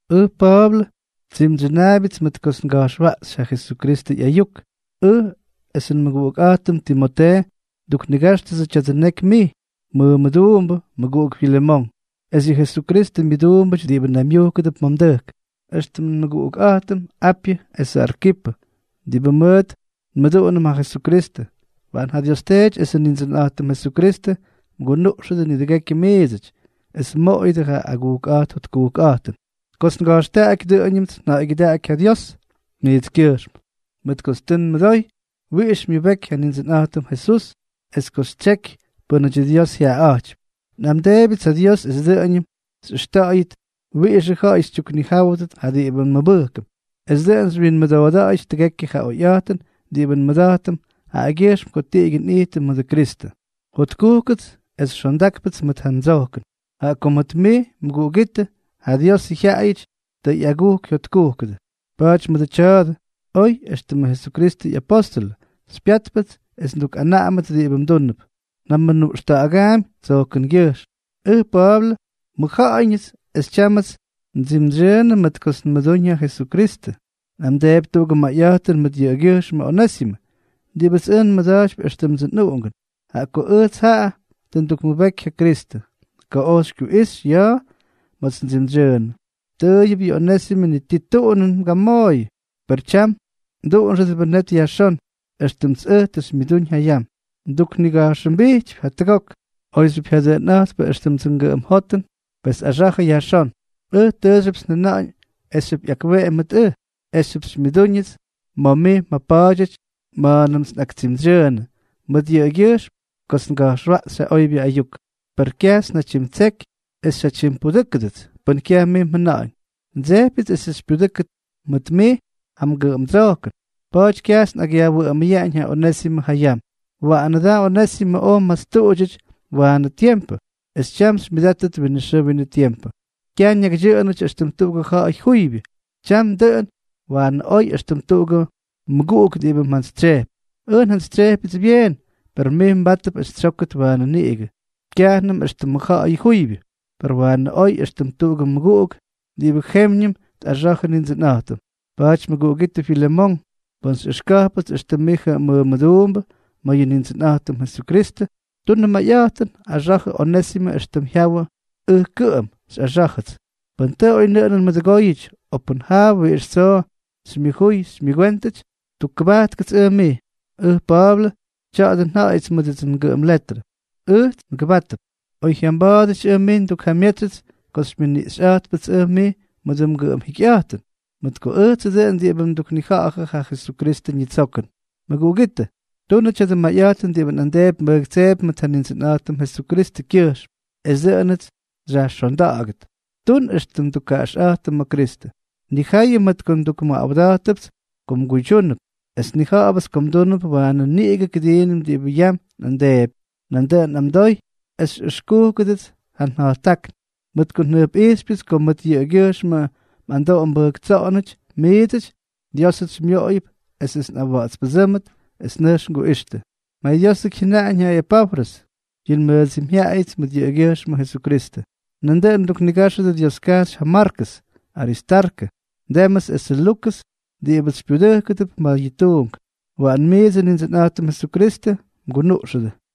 Ʉj Pa̱a̱blʉ. Tsimdsyʉnaabyʉts mʉt kots nga̱jxwaꞌxy ja Jesukristʉ ꞌyayuk. Ʉj esʉ nmʉguꞌukꞌa̱jtʉm Timotee nduknigáxtʉdsʉ tya̱dʉ neky mij, mʉmʉduumbʉ, mʉguꞌuk Filemón, es yʉ Jesukristʉ myʉduumbʉty diꞌibʉ naymyujkʉdʉp ma̱ mdʉjk, éxtʉm nmʉguꞌukꞌa̱jtʉm Apyʉ esʉ Arkipʉ, diꞌibʉ mʉʉt nmʉduꞌunʉm ja Jesukristʉ. Waꞌan ja Dios Teety esʉ Nindsʉnꞌa̱jtʉm Jesukristʉ mgunuꞌxʉdʉ nidʉgekyʉ miidsʉty, es mmoꞌoyʉdʉ ja agujkꞌa̱jt jotkujkꞌa̱jtʉn. Kots nga̱jxtaꞌaky, dʉꞌʉñʉmts nja̱ꞌa̱ygyʉdaꞌaky ja Dios mijtskyʉjxm, mʉt kots tʉ nmʉdoy wiꞌix xymyʉbeky ja Nindsʉnꞌa̱jtʉm Jesús es ko xytsyeky pʉ́nʉty Diosʉ jyaꞌaꞌa̱jtypy. Nꞌamdeebyʉts ja Dios es dʉꞌʉñʉm xꞌʉxta̱ꞌa̱yʉt wiꞌixʉ ja̱ꞌa̱y xytyuknijáwʉdʉt ja diꞌibʉ nmʉbʉjkʉm, esʉ dʉꞌʉn xywyinmʉdooda̱ꞌa̱yʉt tʉgekyʉ ja oyꞌa̱jtʉn diꞌibʉ nmʉda̱jtʉm jaꞌagyʉjxm ko tiꞌigyʉ nꞌijtʉm mʉdʉ Kristʉ. Jotkujkʉts es xondákpʉts mʉt ja mdsojkʉn, jaꞌa ko mʉt mij mʉguꞌugítʉ, ja Diosʉ jyaꞌayʉty tʉ ꞌyagujk jyotkujkʉdʉ. Pa̱a̱ty mʉdʉ tya̱a̱dʉ, oy éxtʉmʉ Jesukristʉ ꞌyapóstʉlʉ xypyátpʉts es ndukꞌanaꞌamʉt diꞌibʉ mdúnʉp, njamʉnuꞌxta̱ꞌa̱gaampy tsojkʉngyʉjxm. Ʉj Pa̱a̱blʉ, mʉjja̱ꞌa̱yñʉts es tyámʉts ndsimdsyʉʉnʉ mʉt kots nmʉdúñ ja Jesukristʉ, nꞌamdeepy tuꞌugʉ mayꞌa̱jtʉn mʉt yʉꞌʉgyʉjxmʉ Onésimʉ, diꞌibʉts ʉj nmʉda̱jtypy éxtʉmdsʉ nꞌuꞌungʉn, jaꞌa ko ʉjts jaꞌa tʉ ndukmʉbeky ja Kristʉ ko oj xykyuꞌixy ya̱a̱ ma̱a̱ts ndsimdsyʉʉnʉ. Tʉʉyʉp yʉ Onésimʉ ni ti tuꞌunʉn mgamooyʉ, per tyam mduꞌunxʉdʉbʉ net yajxón, éxtʉmts ʉj tʉ xymyʉdúñ ja yam. Nduknigajxʉmbijtypy jatʉgok, oyxyʉp jyadʉꞌʉnꞌa̱jtpʉ éxtʉmdsʉ ngʉꞌʉm jotʉn. Pes axa̱jʉ yajxón. Ʉj tʉʉxyʉpts njajʉna̱ꞌa̱ñ esxyʉp ꞌyakweꞌemy mʉt ʉj, esxyʉp xymyʉdúñʉts ma̱ mij mjapa̱a̱dyʉty ma̱a̱nʉmts nꞌaktsimdsyʉʉnʉ mʉt yʉꞌʉgyʉjxm kots nga̱jxwaꞌxy ja oybyʉ ayuk. Per kyajts njatyimtseky es xyjatyimpudʉ́kʉdʉts pʉn kyaj mij mjʉna̱ꞌa̱ñ. Ndsejpyʉts esʉts xypyudʉ́kʉt mʉt mij ja mgʉꞌʉmdsojkʉn, pa̱a̱ty kyajts nꞌakꞌyajwʉꞌʉmʉyaꞌañ ja Onésimʉ ja yam. Waꞌanʉ da Onésimʉ oj mmastuꞌudyʉty waanʉ tiempʉ, es tyam xymyʉdátʉt winʉ xʉʉ winʉ tiempʉ, kyaj ñakydyʉꞌʉnʉty éxtʉm tuꞌugʉ ja̱ꞌa̱y juybyʉ, tyam dʉꞌʉn waanʉ oy éxtʉm tuꞌugʉ mʉguꞌuk diꞌibʉ mjantsytsyejpy. Ʉj njantsytsyejpyʉts byeen, per mij mbátʉp es xytsyókʉt waanʉ niꞌigʉ, kyajnʉm éxtʉmʉ ja̱ꞌa̱y juybyʉ, per waanʉ oy éxtʉm tuꞌugʉ mʉguꞌuk diꞌibʉ jemyñʉm tꞌaxa̱jʉ Nindsʉnꞌa̱jtʉm. Pa̱a̱ty mʉguꞌugítʉ Filemón, pʉn xyꞌʉxka̱jpʉts éxtʉm mijʉ mmʉmʉduumbʉ ma̱ yʉ Nindsʉnꞌa̱jtʉm Jesukristʉ, tunʉ mayꞌa̱jtʉn, axa̱jʉ Onésimʉ éxtʉm jyawʉ ʉj kʉꞌʉm xyꞌaxá̱jʉts. Pʉn tʉ oynʉꞌʉnʉn mmʉdʉgóyʉty, o pʉn jaa wiꞌix tsoo xymyʉjuy xymyʉgwéntʉty, tukkʉbajtkʉts ʉj mij. Ʉj Pa̱a̱blʉ, tya̱a̱dʉ nja̱ꞌa̱yʉts mʉdʉdsʉ ngʉꞌʉm letrʉ: Ʉjts ngʉbátʉp. Oy jyamba̱a̱dʉty ʉj mij ndukjamyetsy ko xymyʉniꞌxyꞌa̱jtpʉts ʉj mij mʉdʉ mgʉꞌʉm jikyꞌa̱jtʉn, mʉt ko ʉjtsʉ dʉꞌʉn diꞌibʉ mduknija̱ꞌa̱jʉ ja Jesukristʉ ñitsokʉn. Mʉguꞌugítʉ, tunʉ tya̱dʉ mayꞌa̱jtʉn diꞌibʉ nꞌamdeepy nbʉjktseepy mʉt ja Nindsʉnꞌa̱jtʉm Jesukristʉkyʉjxm, es dʉꞌʉnʉts xyajxonda̱ꞌa̱gʉt. Tun éxtʉm tukkaꞌaxꞌa̱jtʉm ma̱ Kristʉ. Nnijayʉ mʉt ko ndukmʉꞌawda̱jtʉpts ko mguydyúnʉp, es nnija̱ꞌa̱bʉts ko mdúnʉp waanʉ niꞌigʉ kʉdiinʉm diꞌibʉ yam nꞌamdeepy. Nandʉꞌʉn nꞌamdoy es xyꞌʉxkúkʉdʉts ja nja̱jttákn, mʉt ko njʉjpꞌijxypyʉts ko mʉt yʉꞌʉgyʉjxmʉ mꞌamdoꞌo mbʉjktsoꞌonʉty miidsʉty, Diósʉts xymyoꞌoyʉp esʉts nꞌawa̱ꞌa̱tspʉdsʉ́mʉt es nʉjx nguꞌixtʉ. MayDiósʉk jyʉnaꞌañ ja Epafrʉs, yʉ nmʉdsimyjyaꞌayʉts mʉt yʉꞌʉgyʉjxmʉ Jesukristʉ. Nandʉꞌʉn mduknigáxʉdʉ Dioskajxy ja Markʉs, Aristarkʉ, Demʉs esʉ Lukʉs diꞌibʉts xypyudʉjkʉdʉp ma̱ ja tuunk. Waꞌan miidsʉ Nindsʉnꞌa̱jtʉm Jesukristʉ mgunuꞌxʉdʉ.